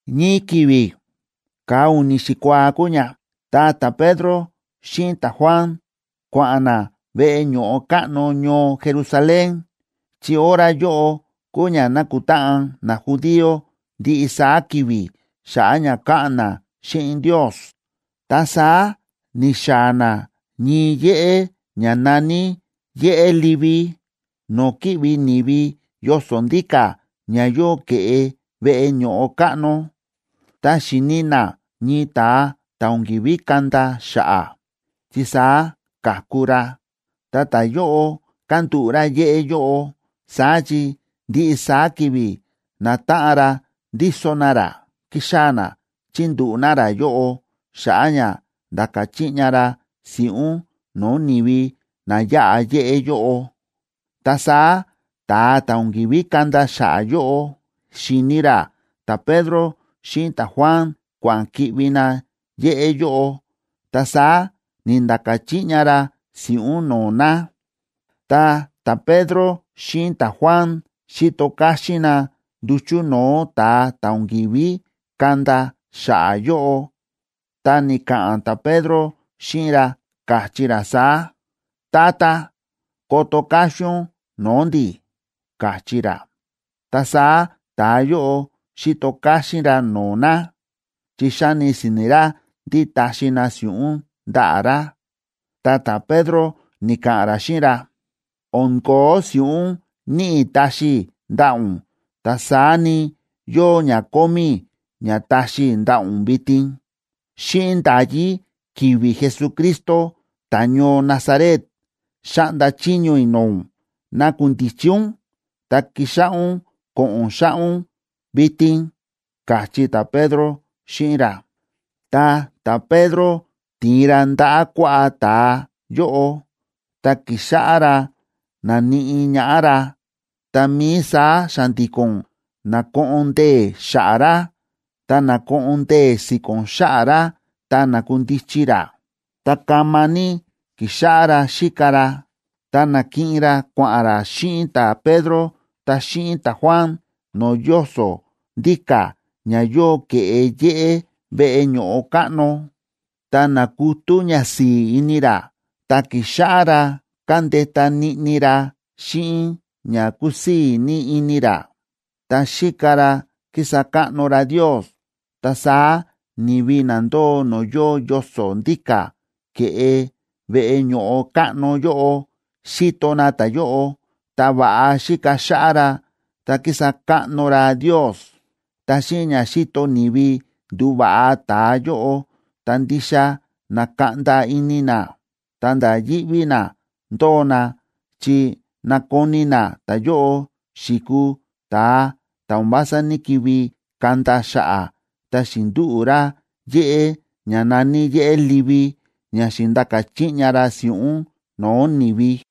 Ñii ki̱vi̱ ka̱a u̱ni̱ xikuaa kúu ña,a ta ta̱Pedro xíꞌin ta̱Juan kua̱ꞌa̱n na veꞌe ño̱ꞌo káꞌno ñoo Jerusalén, chi hora yóꞌo kúu ña nákutáꞌan najudío ndiꞌi saá ki̱vi̱ xa̱ꞌa̱ ña káꞌa̱n na xíꞌin Ndios. Ta saá ni̱xaa̱ na ñii yéꞌé ña na̱ní Yéꞌé Livi no̱o̱ kíꞌvi ni̱vi yoso̱ ndíka̱ ña yóo ke̱ꞌe veꞌe ño̱ꞌo káꞌno. Ta xi̱ni na ñii ta̱a ta̱ o̱n ki̱ví kanda xa̱ꞌa̱, chi saá ka̱ku ra. Ta ta̱yóꞌo kándúꞌu̱ ra yéꞌé yóꞌo, saá chi ndiꞌi saá ki̱vi̱ natáꞌan ra ndíso na ra, ki̱xaa̱ na chi̱ndúꞌu̱ na ra yóꞌo xa̱ꞌa̱ ña nda̱ka̱ chiꞌña ra si̱ꞌún no̱o̱ ni̱vi na yáꞌa yéꞌé yóꞌo. Ta saá ta̱a ta̱ o̱n ki̱ví kanda xa̱ꞌa̱ yóꞌo, xi̱ni ra ta̱Pedro xíꞌin ta̱Juan kua̱ꞌa̱n ki̱ꞌvi na yéꞌé yóꞌo, ta saá ni̱nda̱ka̱ chiꞌña ra si̱ꞌún no̱o̱ na. Ta ta̱Pedro xíꞌin ta̱Juan xi̱to káxín na nduchu̱ no̱o̱ ta̱a ta̱ o̱n ki̱ví kanda xa̱ꞌa̱ yóꞌo, ta ni̱ka̱ꞌa̱n ta̱Pedro xíꞌin ra, káchí ra saá: ―Tata, koto káxín ún no̱o̱ ndi̱ ―káchí ra. Ta saá ta̱a yóꞌo xi̱to káxín ra no̱o̱ na, chi xáni si̱ni̱ ra ndí taxi na si̱ꞌún ndaꞌa̱ ra. Ta ta̱Pedro ni̱ka̱ꞌa̱n ra xíꞌin ra: ―O̱n ko̱ó si̱ꞌún níꞌi i̱ taxi i̱ ndaꞌa̱ ún, ta saá ni, yóo ña kómí i̱ ña taxi i̱ ndaꞌa̱ ún vitin. Xíꞌin nda̱yí ki̱vi̱ Jesucristo ta̱ñoo Nazaret, xáꞌnda chiño i̱ no̱o̱ ún nakundichi ún, ta kixáꞌá ún ko̱ꞌo̱n xáꞌá ún vitin ―káchí ta̱Pedro xíꞌin ra. Ta ta̱Pedro ti̱in ra ndaꞌa̱ kuaꞌá ta̱a yóꞌo, ta ki̱xáꞌá ra ndáníꞌi ñaꞌá ra, tá mií saá xa̱ndi̱ko̱n na̱koꞌon ndee̱ xa̱ꞌa̱ ra, ta na̱koꞌon ndee̱ si̱ko̱n xa̱ꞌa̱ ra, ta na̱kundichi ra, ta kama ní ki̱xáꞌá ra xíka ra. Ta na̱kiꞌin ra kua̱ꞌa̱n ra xíꞌin ta̱Pedro, ta xíꞌin ta̱Juan, no̱o̱ yoso̱ ndíka̱ ña yóo ke̱ꞌe yéꞌé veꞌe ño̱ꞌo káꞌno. Ta na̱kutú ñasi̱i̱ ini ra, ta ki̱xáꞌá ra kándeta niꞌni ra xíꞌin ña kúsii̱ ní ini ra, ta xíka ra kísa káꞌno ra Ndios. Ta saá ni̱vi na ndóo no̱o̱ yóo yoso̱ ndíka̱ ke̱ꞌe veꞌe ño̱ꞌo káꞌno yóꞌo, xíto na ta̱yóꞌo, ta va̱ꞌa xíka xáꞌá ra, ta kísa káꞌno ra Ndios. Ta xíꞌin ña xíto ni̱vi ndu̱va̱ꞌa ta̱a yóꞌo, ta ndixa na̱kaꞌnda ini na, ta̱nda̱ yíꞌví na ndóo na, chi na̱koni na ta̱yóꞌo xi̱kuu ta̱a ta̱ o̱n vása ní‑kivi kanda xa̱ꞌa̱, ta xi̱ndúꞌu̱ ra yéꞌé ña na̱ní Yéꞌé Livi, ña xi̱ndaka chiꞌña ra si̱ꞌún no̱o̱ ni̱vi.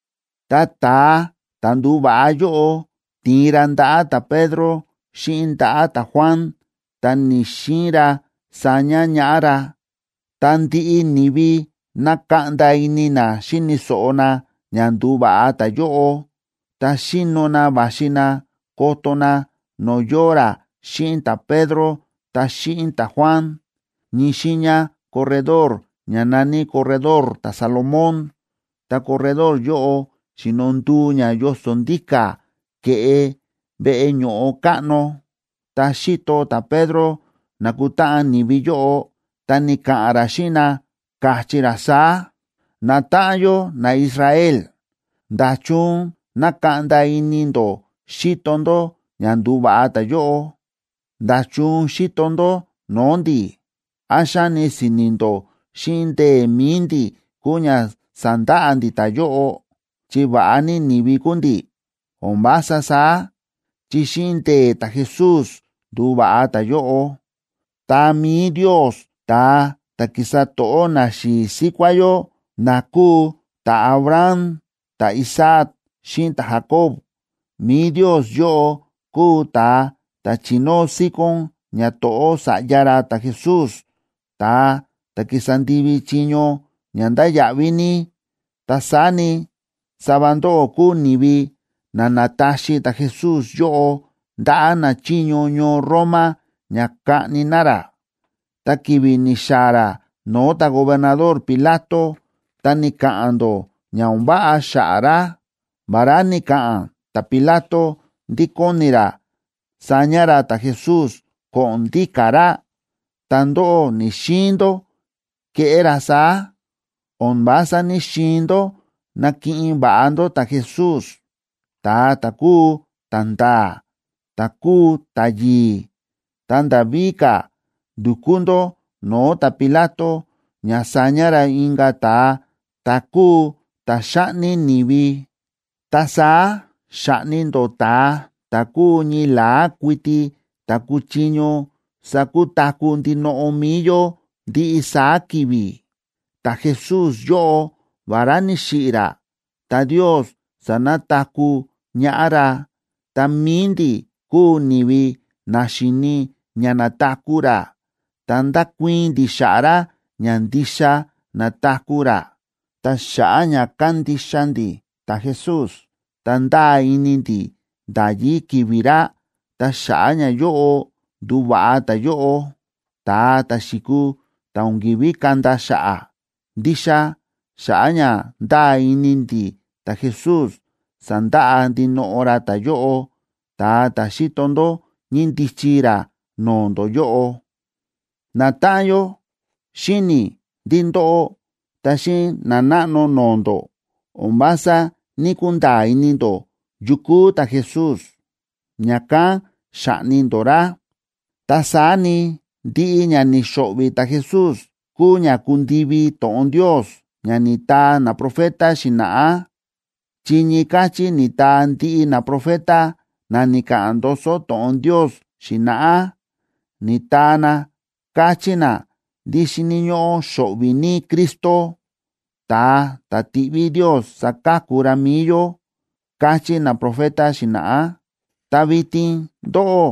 Ta ta̱a ta̱ ndu̱va̱ꞌa yóꞌo ti̱in ra ndaꞌa̱ ta̱Pedro xíꞌin ndaꞌa̱ ta̱Juan, ta ni̱‑xiin ra saña ñaꞌá ra. Ta ndiꞌi ni̱vi na̱kaꞌnda ini na xíni̱ so̱ꞌo na ña ndu̱va̱ꞌa ta̱yóꞌo, ta xíno na va̱xi na koto na no̱o̱ yóo ra xíꞌin ta̱Pedro ta xíꞌin ta̱Juan, ñii xiiña corredor, ña na̱ní Corredor ta̱Salomón. Ta corredor yóꞌo xíno nduu ña yoso̱ ndíka̱ ke̱ꞌe veꞌe ño̱ꞌo káꞌno. Tá xíto ta̱Pedro na̱kutáꞌan ni̱vi yóꞌo, ta ni̱ka̱ꞌa̱n ra xíꞌin na, káchí ra saá: ―Natáꞌan yó naIsrael, ¿nda̱chun nákaꞌnda ini ndó xíto ndó ña ndu̱va̱ꞌa ta̱yóꞌo? ¿Nda̱chun xíto ndó no̱o̱ ndi̱? ¿Án xáni si̱ni̱ ndó xíꞌin ndee̱ mi̱i ndi̱ kúu ña sa̱ndaꞌa ndi̱ ta̱yóꞌo, chi va̱ꞌa ní ni̱vi kúu ndi̱? O̱n vása saá, chi xíꞌin ndee̱ ta̱Jesús ndu̱va̱ꞌa ta̱yóꞌo. Ta mi̱i Ndios ta̱a ta̱ ki̱sa to̱ꞌó naxi̱i̱ síkuá yó, na kúu ta̱Abraham, ta̱Isaac xíꞌin ta̱Jacob, mi̱i Ndios yóꞌo kúu ta̱a ta̱ chi̱nóo síkón ñato̱ꞌó Sa̱ꞌya ra ta̱Jesús, ta̱a ta̱ ki̱sa ndivi chiño ña ndáya̱ꞌví ní. Ta saá ni, sava ndóꞌó kúu ni̱vi na na̱taxi ta̱Jesús yóꞌo ndaꞌa̱ nachiño ñoo Roma ña kaꞌni na ra. Ta ki̱vi̱ ni̱xaa̱ ra no̱o̱ ta̱gobernador Pilato, ta ni̱ka̱ꞌa̱n ndó ña o̱n váꞌa xa̱ꞌa̱ ra. Vará ni̱ka̱ꞌa̱n ta̱Pilato ndí kóni ra saña ra ta̱Jesús ko̱ꞌo̱n ndíka̱ ra, ta ndóꞌó ni̱‑xiin ndó keꞌé ra saá. O̱n vása ní‑xiin ndó nakiꞌin va̱ꞌa ndó ta̱Jesús, ta̱a ta̱ kúu ta̱nda̱a̱, ta̱ kúu ta̱yi̱i̱, ta nda̱ víka̱ ndu̱kú ndó no̱o̱ ta̱Pilato ña saña ra inka̱ ta̱a, ta̱ kúu ta̱ xáꞌni ni̱vi. Ta saá xa̱ꞌni ndó ta̱a ta̱ kúu ñii la̱á kuiti ta̱ kúchiño sakutaku̱ ndinoꞌo mi̱i yó ndiꞌi saá ki̱vi̱. Ta̱Jesús yóꞌo, vará ni̱xiꞌi̱ ra, ta Ndios sa̱nataku̱ ñaꞌá ra, ta mi̱i ndi̱ kúu ni̱vi na xi̱ni ña na̱taku̱ ra, ta ndákuii̱n ndi̱ xa̱ꞌa̱ ra ña ndixa na̱taku̱ ra. Ta xa̱ꞌa̱ ña kándixa ndi̱ ta̱Jesús ta ndáa ini ndi̱ nda̱yí ki̱vi̱ ra, ta xa̱ꞌa̱ ñayóꞌo ndu̱va̱ꞌa ta̱yóꞌo, ta̱a ta̱ xi̱kuu ta̱ o̱n ki̱ví kanda xa̱ꞌa̱. Ndixa xa̱ꞌa̱ ña ndáa ini ndi̱ ta̱Jesús, sa̱ndaꞌa ndinoꞌo ra ta̱yóꞌo, ta̱a ta̱ xíto ndó ñíndichi ra no̱o̱ ndó yóꞌo. ’Natáꞌan yó, xíni̱ i̱ ndí ndóꞌó, ta xíꞌin nanáꞌno no̱o̱ ndó, o̱n vása ní‑kunda̱a̱ ini ndó yu kúu ta̱Jesús, ña̱kán xa̱ꞌni ndó ra. Ta saá ni, ndiꞌi ña ni̱xo̱ꞌvi̱ ta̱Jesús kúu ña ku̱ndivi to̱ꞌon Ndios ña ni̱taa naprofeta xi̱na̱ꞌá, chi ñii káchí ni̱taa ndiꞌi naprofeta na ni̱ka̱ꞌa̱n ndoso to̱ꞌon Ndios xi̱na̱ꞌá, ni̱taa na káchí na ndí xíni̱ ñóꞌó xo̱ꞌvi̱ ní Cristo, ta̱a ta̱ tiꞌví Ndios saka̱ku ra mi̱i yó, káchí naprofeta xi̱na̱ꞌá. Ta vitin ndóꞌó,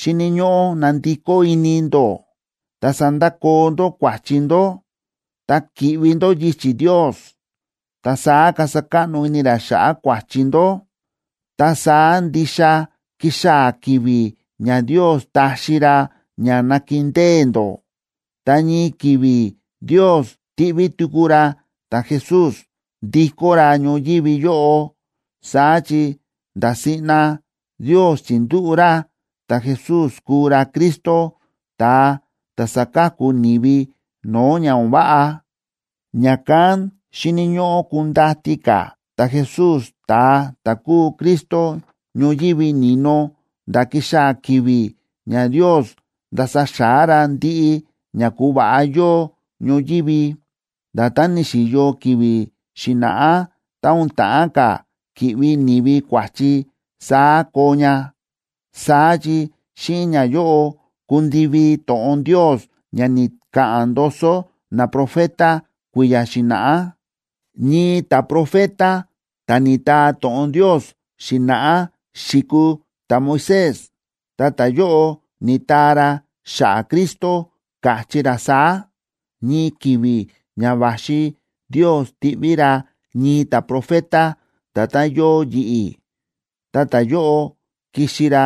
xíni̱ ñóꞌó nandikó ini ndó, ta sandakoo ndó kua̱chi ndó, ta ki̱ꞌvi ndó yichi̱ Ndios. Ta saá kasa káꞌno ini ra xa̱ꞌa̱ kua̱chi ndó. Ta saá ndixa kixaa̱ ki̱vi̱ ña Ndios taxi ra ña nakindée ndó. Ta ñii ki̱vi̱ Ndios tiꞌví tuku ra ta̱Jesús, ndikó ra ñoyívi yóꞌo. Saá chi nda̱ siꞌna Ndios chi̱ndúꞌu̱ ra ta̱Jesús kuu ra Cristo, ta̱a ta̱ saka̱ku ni̱vi no̱o̱ ña o̱n váꞌa. Ña̱kán xíni̱ ñóꞌó kundati ka̱ ta̱Jesús, ta̱a ta̱ kúu Cristo, ñoyívi ni̱no nda̱ kixaa̱ ki̱vi̱ ña Ndios ndasa xa̱á ra ndiꞌi ña ku̱va̱ꞌa yóo ñoyívi. Nda̱tán ni̱xi̱yo ki̱vi̱ xi̱na̱ꞌá tá o̱n ta̱ꞌán ka̱ ki̱ꞌvi ni̱vi kua̱chi saá koo ña. Saá chi xíꞌin ñayóꞌo kundivi to̱ꞌon Ndios ña ni̱ka̱ꞌa̱n ndoso naprofeta kui̱ya̱ xi̱na̱ꞌá. Ñii ta̱profeta ta̱ ni̱taa to̱ꞌon Ndios xi̱na̱ꞌá xi̱kuu ta̱Moisés, ta ta̱yóꞌo ni̱taa ra xa̱ꞌa̱ Cristo, káchí ra saá: “Ñii ki̱vi̱ ña va̱xi Ndios tiꞌví ra ñii ta̱profeta nda̱tán yóo yi̱ꞌi̱. Ta ta̱yóꞌo kixi ra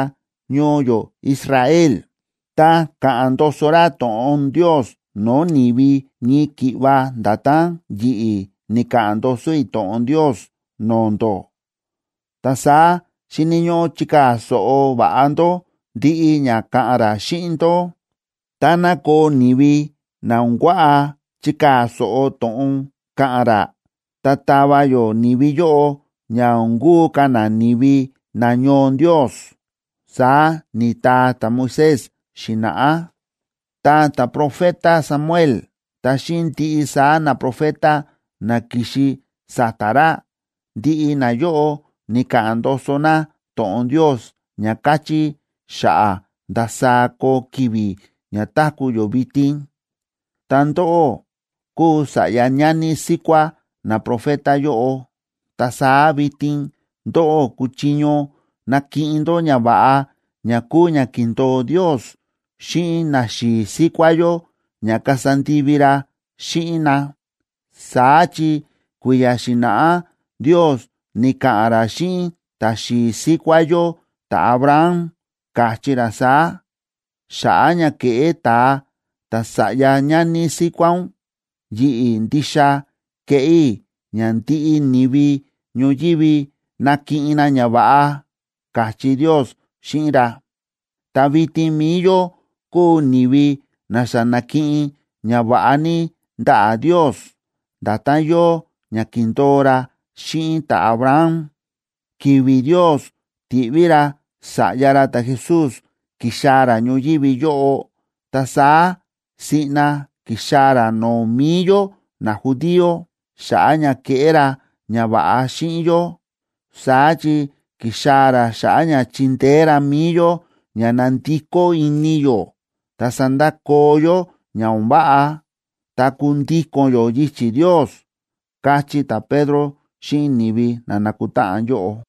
ñoo yó Israel, ta ka̱ꞌa̱n ndoso ra to̱ꞌon Ndios no̱o̱ ni̱vi ñii ki̱ꞌva nda̱tán yi̱ꞌi̱ ni̱ka̱ꞌa̱n ndoso i̱ to̱ꞌon Ndios no̱o̱ ndó. Ta saá xíni̱ ñóꞌó chikaa̱ so̱ꞌo va̱ꞌa ndó ndiꞌi ña ka̱ꞌa̱n ra xíꞌin ndó. Táná koo ni̱vi na o̱n kuaꞌa chikaa̱ so̱ꞌo to̱ꞌon ka̱ꞌa̱n ra, ta tava yó ni̱vi yóꞌo ña o̱n kuu ka̱ na ni̱vi nañoo Ndios”, saá ni̱taa ta̱Moisés xi̱na̱ꞌá. ’Ta ta̱profeta Samuel, ta xíꞌin ndiꞌi saá naprofeta na ki̱xi sa̱ta̱ ra, ndiꞌi nayóꞌo ni̱ka̱ꞌa̱n ndoso na to̱ꞌon Ndios ña káchí xa̱ꞌa̱ ndasaá koo ki̱vi̱ ña táku̱ yó vitin. Ta ndóꞌó kúu sa̱ꞌya ñani síkuá naprofeta yóꞌo, ta saá vitin ndóꞌó kúchiño nakiꞌin ndó ñava̱ꞌa ña kúu ña ki̱ndo̱o Ndios xíꞌin naxi̱i̱ síkuá yó ña kasa ndivi ra xíꞌin na. Saá chi kui̱ya̱ xi̱na̱ꞌá Ndios ni̱ka̱ꞌa̱n ra xíꞌin ta̱xi̱i̱ síkuá yó ta̱Abraham, káchí ra saá: “Xa̱ꞌa̱ ña keꞌé ta̱a ta̱sa̱ꞌya ñani síkuá ún, yi̱ꞌi̱ ndixa keꞌé i̱ ña ndiꞌi ni̱vi ñoyívi nakiꞌin na ñava̱ꞌa”, káchí Ndios xíꞌin ra. Ta vitin mi̱i yó kúu ni̱vi na xa na̱kiꞌin ñava̱ꞌa ní ndaꞌa̱ Ndios, nda̱tán yóo ña ki̱ndo̱o ra xíꞌin ta̱Abraham. Ki̱vi̱ Ndios ti̱ꞌví ra Sa̱ꞌya ra ta̱Jesús kixaa̱ ra ñoyívi yóꞌo, ta saá siꞌna ki̱xaa̱ ra no̱o̱ mi̱i yó najudío xa̱ꞌa̱ ña keꞌé ra ñava̱ꞌa xíꞌin yó. Saá chi ki̱xaa̱ ra xa̱ꞌa̱ ña chindeé ra mi̱i yó ña nandikó ini yó ta sandakoo yó ña o̱n váꞌa, ta kundíko̱n yó yichi̱ Ndios ―káchí ta̱Pedro xíꞌin ni̱vi na na̱kutáꞌan yóꞌo.